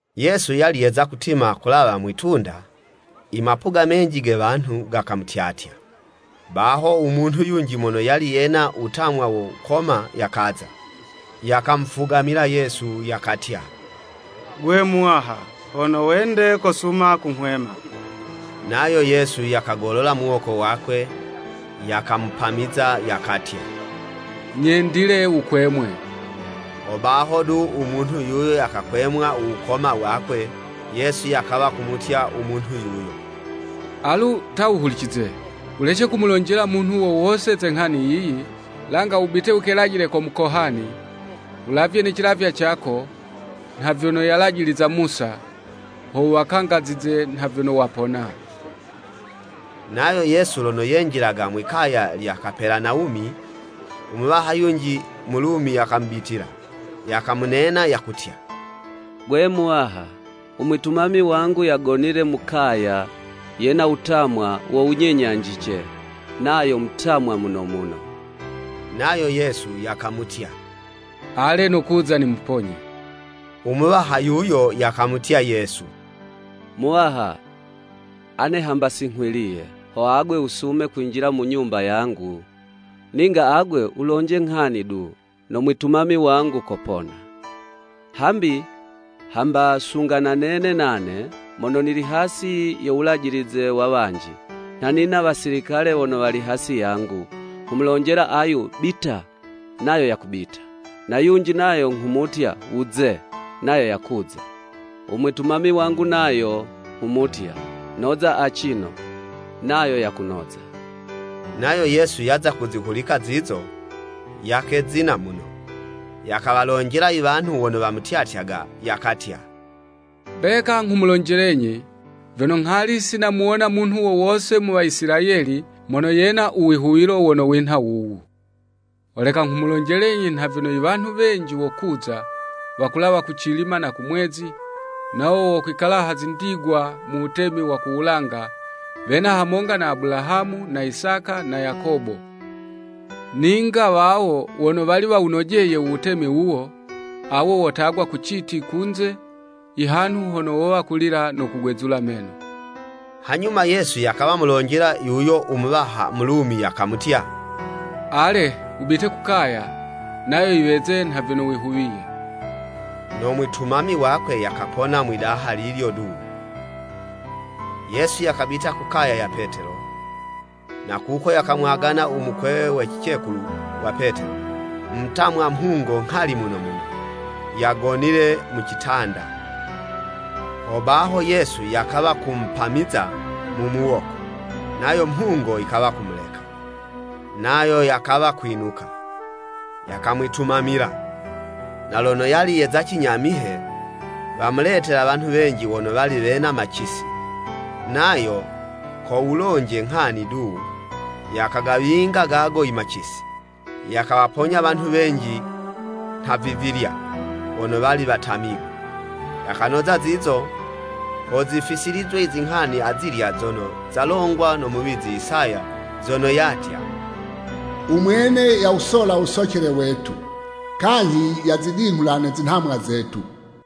Yesu yali yeza kutima yakulawa mwi'tunda, imapuga menji ge wanhu, gakamutyatya. Baho u munhu yunji mono yali yena wutamwa wo wukoma yakaza, yakamufugamila Yesu, yakatya, “Gwe Muwaha, hono wende kosuma kunghwema.” Nayo Yesu yakagolola muwoko wakwe, yakamupamiza, yakatya, “Nyendile wukwemwe.” Hobaho du u munhu yuyo yakakwemwa u wukoma wakwe. Yesu yakawa kumutya umunhu yuyo, “Alu, ta wuhulicize, wulece kumulonjela umunhu wo wose ze nghani yiyi, langa wubite wukelajile ko mukohani, wulavye ne cilavywa cako, nha vyono yalajiliza Musa, ho wuwakangazize nha vyono wapona.” Nayo Yesu lono yenjilaga mwi'kaya lya Kapelanawumi, u muwaha yunji Mulumi yakamubitila, yakamunena, yakutya, “Gwe Muwaha, u mwitumami wangu yagonile mu kaya, yena wutamwa wo wunyenyanjice, nayo mutamwa muno muno.” Nayo Yesu yakamutya, “Ale nokuza nimuponye.” U muwaha yuyo yakamutya Yesu, “Muwaha, ane hamba si nghwiliye, ho agwe wusume kwinjila mu nyumba yangu. Ninga agwe wulonje nghani du, no mwitumami wangu kopona.” Hambi, hamba sunga na nene nane, mono nili hasi yo wulajilize wa wanji, nha nina wasilikale wono wali hasi yangu. Nghumulonjela ayu “Bita!” nayo yakubita, na yunji nayo nghumutya, “Wuze!” nayo yakuza; u mwitumami wangu nayo nghumutya, “Noza acino! nayo yakunoza.” Nayo Yesu yaza kuzihulika zizo, yakezina muno, yakawalonjela iwanhu wono wamutyatyaga, yakatya, “Mbeka nghumulonjelenyi, vyono nghali si namuwona munhu wo wose mu Waisilayeli mono yena u wihuwilo wono winha wuwu. Holeka nghumulonjelenyi nha vyono iwanhu wenji wokuza, wakulawa kucilima na kumwezi, nawo wokwikala ha zindigwa mu wutemi wa ku wulanga, wena hamonga na Abulahamu na Isaka, na Yakobo. Ninga wawo wono wali wawunojeye uwutemi wuwo, awo wotagwa ku citi kunze, ihanhu hono wowa kulila no kugwezula meno.” Hanyuma Yesu yakawa kumulonjela yuyo u muwaha Mulumi yakamutya, “Ale, wubite ku kaya, nayo yiweze nha vyono wihuwiye.” No mwitumami wakwe yakapona mwidaha lilyo du. Yesu yakabita ku kaya ya Petelo, na kuko yakamwagana u mukwewe we cicekulu wa Petelo mutamwa mhungo nghali muno muno, yagonile mu citanda. Hobaho, Yesu yakawa kumupamiza mu muwoko, nayo mhungo yikawa kumuleka, nayo yakawa kwinuka, yakamwitumamila. Na lono yali yeza cinyamihe, wamuletela wanhu wenji wono wali wena macisi, nayo, ko wulonje nghani du, yakagawinga gago imacisi. Yakawaponya wanhu wenji nhavivilya, wono wali watamigwe. Yakanoza zizo, ho zifisilizwe izinghani azilya zono zalongwa no muwizi Isaya zono yatya, “U Mwene yawusola u wusocele wetu kanyhi yazidinghula ne zinhamwa zetu.”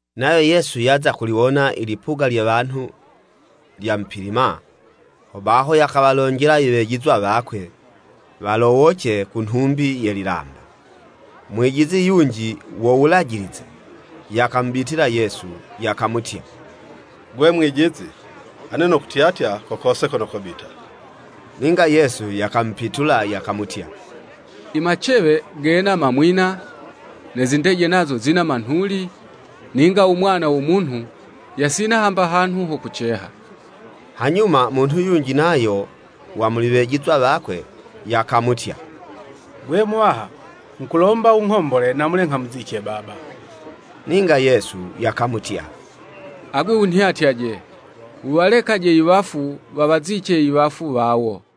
Nayo Yesu yaza kuliwona ilipuga lye wanhu lyamupilima, hobaho yakawalonjela iwejizwa wakwe walowoce ku nhumbi ye lilamba. Mwijizi yunji wo Wulajilize yakamubitila Yesu, yakamutya, “Gwe Mwijizi, ane nokutyatya ko kose kono kobita.” Ninga Yesu yakamupitula yakamutya, “Imacewe, gena mamwina, ne zindeje nazo zina manhuli, ninga u Mwana wo Munhu, yasina hamba hanhu ho kuceha.” Hanyuma munhu yunji nayo wa muli wejizwa wakwe, yakamutya, “Gwe, Muwaha nghukulomba wunghombole namule nghamuzice baba.” Ninga Yesu yakamutya, “Agwe wunhyatyaje! Wuwalekaje iwafu wawazice iwafu wawo.”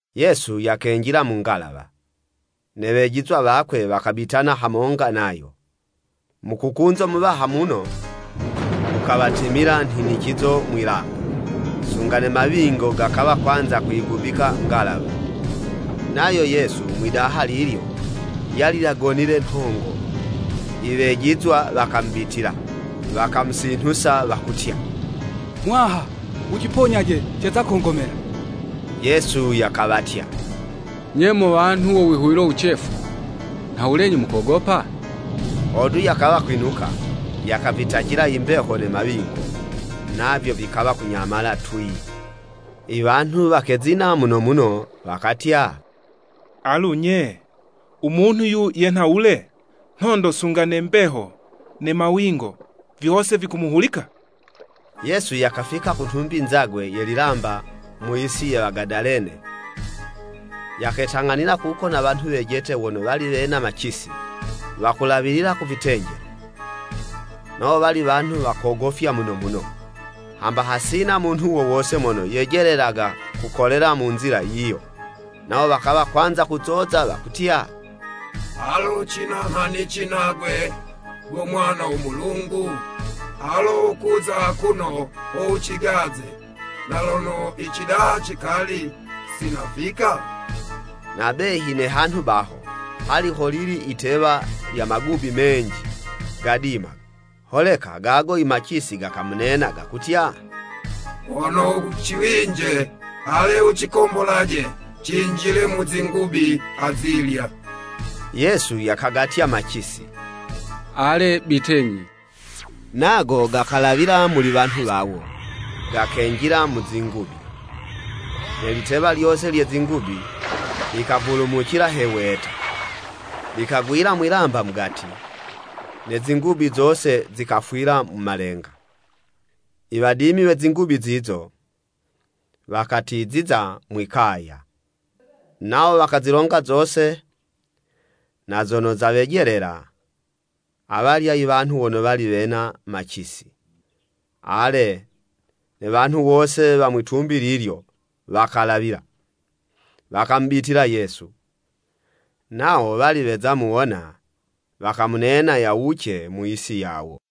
Yesu yakenjila mu ngalawa, ne wejizwa wakwe vikabitana hamonga nayo. Mukukunzo muwaha muno, likawatimila nhinicizo mwi'lamba, sunga ne mawingo gakawa kwanza kuyigubika ngalawa. Nayo Yesu mwi'daha lilyo, yali yagonile nhongo. Iwejizwa wakamubitila, wakamusinhusa wakutya, “Muwaha, wuciponyaje ceza kongomela!” Yesu yakawatya, “Nye mo wanhu wo wihuwilo wucefu, nhawulenyi mukogopa?” Hodu yakawa kwinuka, yakavitacila imbeho ne mawingo, navyo vikawa kunyamala twii. Iwanhu wakezina muno muno, wakatya, “Alu, nye, u munhu 'yu yenha wule? Nhondo sunga ne mbeho ne mawingo, vyose vikumuhulika!” Yesu yakafika ku nhumbi nzagwe ye lilamba mu yisi ya Wagadalene, yaketang'anila kuko na wanhu wejete wono wali wena macisi, wakulawilila ku vitenjelo. Nawo wali wanhu wa kogofya muno muno, hamba hasina munhu wo wose mono yejelelaga kukolela mu nzila yiyo. Nawo wakawa kwanza kuzoza wakutya, “Alo cina nghanici nagwe go Mwana wo Mulungu? Alo kuza akuno ho wucigaze na lono icidaha cikali si nafika?” Na behi ne hanhu baho, hali holili yitewa lya magubi menji, gadimaga. Holeka gago imacisi gakamunena gakutya, “Hono wuciwinje, ale wucikombolaje cinjile mu zingubi azilya.” Yesu yakagatya macisi, “Ale, Bitenyi.” Nago gakalawila muli wanhu wawo, gakenjila mu zingubi. Ne litewa lyose lye zingubi likavulumucila he weta, likagwila mwi'lamba mugati, ne zingubi zose zikafwila mu malenga. Iwadimi we zingubi zizo, wakatiziza ku kaya. Nawo wakazilonga zose na zono zawejelela awalya iwanhu wono wali wena macisi. Ale, ne wanhu wose wa mwi'tumbi lilyo, wakalawila, wakamubitila Yesu, nawo wali weza muwona wakamunena yawuce mu yisi yawo.